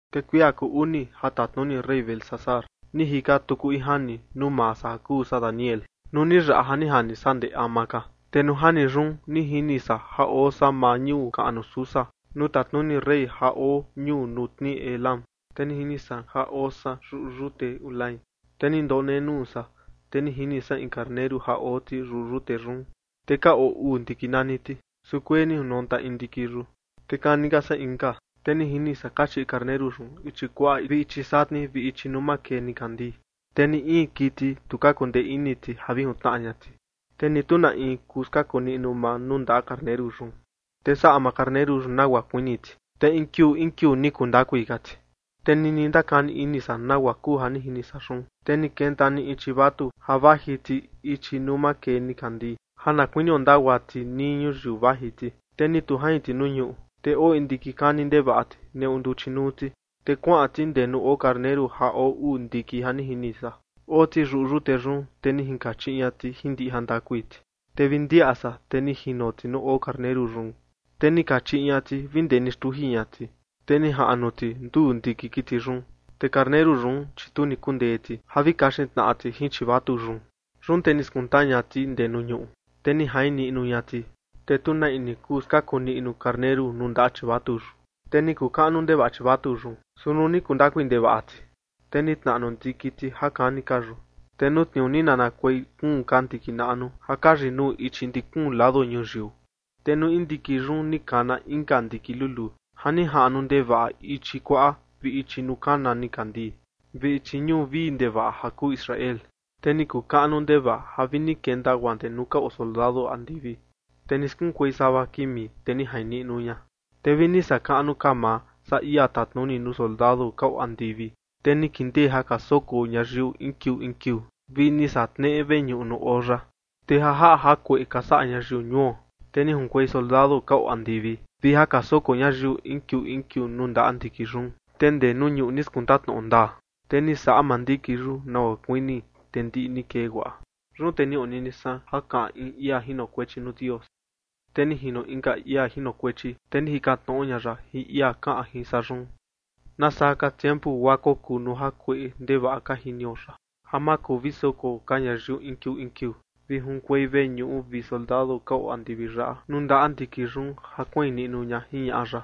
Te kuia kuu uni ja tatnuni rey Belsasar, ni jika tuku in jani nuu maa san ja kuu san Daniel, nuu ni yaꞌa ja ni jani san ndee ama ka. Te nuu jani yun, ni jini san ja oo san maa ñuu kaꞌnu Susa nuu tatnuni rey ja oo ñuu nuu tnii Elam, te ni jini san ja oo san yuꞌu yute Ulai. Te ni ndonenuu san, te ni jini san in karneru ja oo ti yuꞌu yute yun, te ka oo uu ndiki nani ti, su kuee ni jinonta in ndiki yun, te kani ka saa inka. Te ni jini san kachiꞌi karneru yun ichi kuaꞌa vi ichi satni vi ichi nuu makee nikandii. Te ni in kiti, tu ka kundee ini ti ja vi jintnaꞌa ña ti, te ni tu na in kuu ja skaku maa nuu ndaꞌa karneru yun. Te saꞌa maa karneru yun nagua kuini ti, te in kiuu in kiuu ni kuu ndakui ka ti. Te nini ndakani ini san nagua kuu ja ni jini san yun, te ni kenta ni in chivatu ja vaji ti ichi nuu makee nikandii ja na kuinio ndagua ti nii ñuyiu vaji ti. Te ni tu jain ti nuu ñuꞌu, te oo in ndiki kani ndevaꞌa ti neꞌu nduchi nuu ti. Te kuaꞌan ti ndee nuu oo karneru ja oo uu ndiki ja ni jini san, oo ti yuꞌu yute yun, te ni jinkachiꞌi ña ti jin ndiꞌi jandakui ti. Te vi ndiaꞌa san, te ni jino ti nuu oo karneru yun, te ni kachiꞌi ña ti vi ndee ni xtuji ña ti, te ni jaꞌnu ti nduu ndiki kiti yun. Te karneru yun, chi tu ni kundee ti ja vi kaxin tnaꞌa ti jin chivatu yun. Yun te ni skunta ña ti ndee nuu ñuꞌu, te ni jain niꞌnu ña ti, te tu na in ni kuu ja skaku niꞌnu karneru nuu ndaꞌa chivatu yun. Te ni kuu kaꞌnu ndevaꞌa chivatu yun, su nuu ni kuu ndakui ndevaꞌa ti, te ni tnaꞌnu ndiki ti ja kani ka yun, te nuu tniuu ni nanakuei kuun ka ndiki naꞌnu ja ka yinuu ichi ndi kuun lado ñuyiu. Te nuu in ndiki yun ni kana inka ndiki luluu, ja ni jaꞌnu ndevaꞌa ichi kuaꞌa vi ichi nuu kana nikandii, vi ichi ñuu vii ndevaꞌa ja kuu Israel. Te ni kuu kaꞌnu ndevaꞌa ja vi ni kenta guaa ndee nuu ka oo soldado andivi, te ni skunkuei sava kimi, te ni jain niꞌnu ña. Te vi ni saꞌa kaꞌnu ka maa saa ia tatnuni nuu soldado ka oo andivi, te ni kindee ja ka soko ñayiu in kiuu in kiuu, vi ni saꞌa tneꞌe veñuꞌu nuu oo ya. Te ja jaꞌa jakueꞌe ka saꞌa ñayiu ñuo, te ni junkuei soldado ka oo andivi vi ja ka soko ñayiu in kiuu in kiuu nuu ndaꞌa ndiki yun, te ndee nuu ñuꞌu ni skunta tnoꞌo ndaa, te ni saꞌa maa ndiki yun nagua kuini, te ndiꞌi ni kee guaꞌa. Yun te ni onini san ja kaꞌan in ia jinokuechi nuu Dios, te ni jino inka ia jinokuechi, te ni jikan tnoꞌo ña ya jin ia kaꞌan jin san yun: “¿Nasaa ka tiempu guaa kokuu nuu jakueꞌe ndevaꞌa ka jinio yaꞌa, ja ma kuu vi soko ka ñayiu in kiuu in kiuu, vi junkuei veñuꞌu vi soldado ka oo andivi yaꞌa nuu ndaꞌa ndiki yun ja kuain niꞌnu ña?”, jiñaꞌa ya.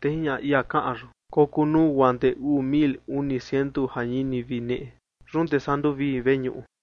Te jiñaꞌa ia kaꞌan yun: “Kokuu nuu guaa ndee uu mil uni ciento jañini vi neꞌe. Yun te saa nduvii veñuꞌu.”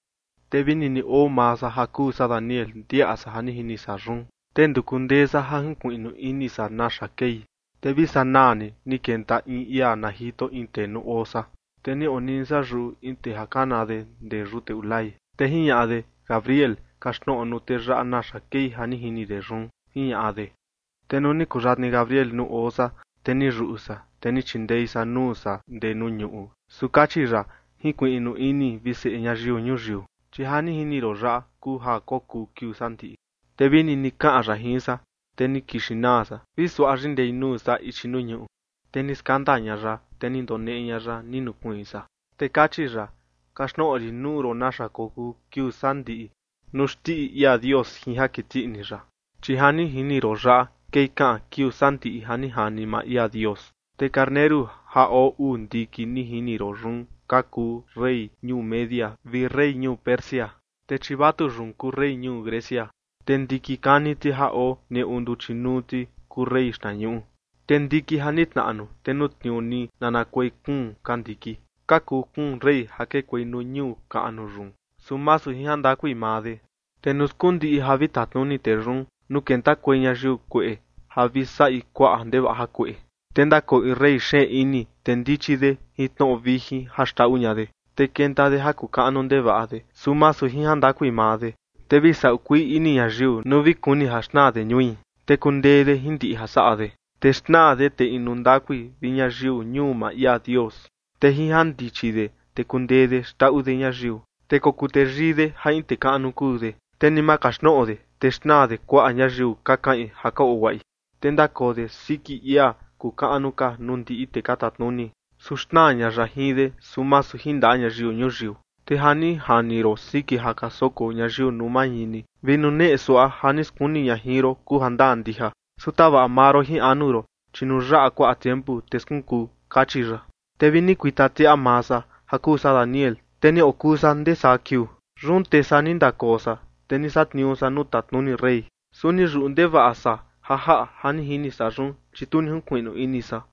Te vi nini oo maa san ja kuu san Daniel ndiaꞌa san ja ni jini san yun, te nduku ndee san ja jinkuiꞌnu ini san naxa kei, te vi sanaa ni ni kenta in ia na jito in tee nuu oo san. Te ni onini san yuꞌu in tee ja kana de ndee yute Ulai, te jiñaꞌa de: ―Gabriel, kaxtnoꞌo nuu tee yaꞌa naxa kei ja ni jini de yun ―jiñaꞌa de. Te nuu ni kuyatni Gabriel nuu oo san, te ni yuꞌu san, te ni chindei san nuu san ndee nuu ñuꞌu. Su kachi ya: ―Jinkuiꞌnu ini, vi seꞌe ñayiu ñuyiu, chi ja ni jini ron yaꞌa kuu ja kokuu kiuu sandiꞌi. Te vi nini kaꞌan ya jin san, te ni kixin naa san vi suaꞌa yindei nuu san ichi nuu ñuꞌu. Te ni skandaa ña ya, te ni ndoneꞌe ña ya, ni nukuiin san. Te kachi ya: ―Kaxtnoꞌo rin nuu ron naxa kokuu kiuu sandiꞌi nuu xndiꞌi ia Dios jin ja kiti ini ya, chi ja ni jini ron yaꞌa kei kaꞌan kiuu sandiꞌi ja ni jani maa ia Dios. Te karneru ja oo uu ndiki ni jini ron yun ka kuu rey ñuu Media vi rey ñuu Persia. Te chivatu yun kuu rey ñuu Grecia, te ndiki kani ti ja oo neꞌu nduchi nuu ti kuu rey xtnañuꞌu. Te ndiki ja ni tnaꞌnu, te nuu tniuu ni nanakuei kuun ka ndiki, ka kuu kuun rey ja kekuei nuu ñuu kaꞌnu yun, su masu jin jandakui maa de. Te nuu skundiꞌi ja vi tatnuni tee yun, nuu kentakuei ñayiu kueꞌe ja vi saꞌi kuaꞌa ndevaꞌa jakueꞌe, te ndakoo in rey xeen ini, te ndichi de jin tnoꞌo vijin ja xndaꞌu ña de. Te kenta de ja kuu kaꞌnu ndevaꞌa de, su masu jin jandakui maa de, te vi saꞌu kuii ini ñayiu nuu vi kuni ja xnaa de ñui, te kundee de jin ndiꞌi ja saꞌa de, te xnaa de tee inu ndakui vi ñayiu ñuu maa ia Dios. Te jin jandichi de te kundee de xndaꞌu de ñayiu, te kokuu teyii de ja in tee kaꞌnu kuu de, te ni ma kaxtnoꞌo de, te xnaa de kuaꞌa ñayiu ka kaꞌin ja ka oo guaꞌi. Te ndakoo de siki ia kuu kaꞌnu ka nuu ndiꞌi tee ka tatnuni. Su xnaa ña ya jin de, su masu jin ndaꞌa ñayiu ñuyiu. ’Te ja ni jani ron siki ja ka soko ñayiu nuu mañini vi nuneꞌe suaꞌa ja ni skuni ña jin ron kuu jandaa ndija. Su tavaꞌa maa ron jin anu ron, chi nuu yaꞌa kuaꞌa tiempu, te skunkuu. Kachi ya. Te vi ni kuita tiaꞌa maa san, ja kuu san Daniel, te ni okuꞌu san ndee saa kiuu. Yun te saa ni ndakoo san, te ni satniuu san nuu tatnuni rey. Su ni yuꞌu ndevaꞌa san ja jaꞌa ja ni jini san yun, chi tu ni jinkuiꞌnu ini san.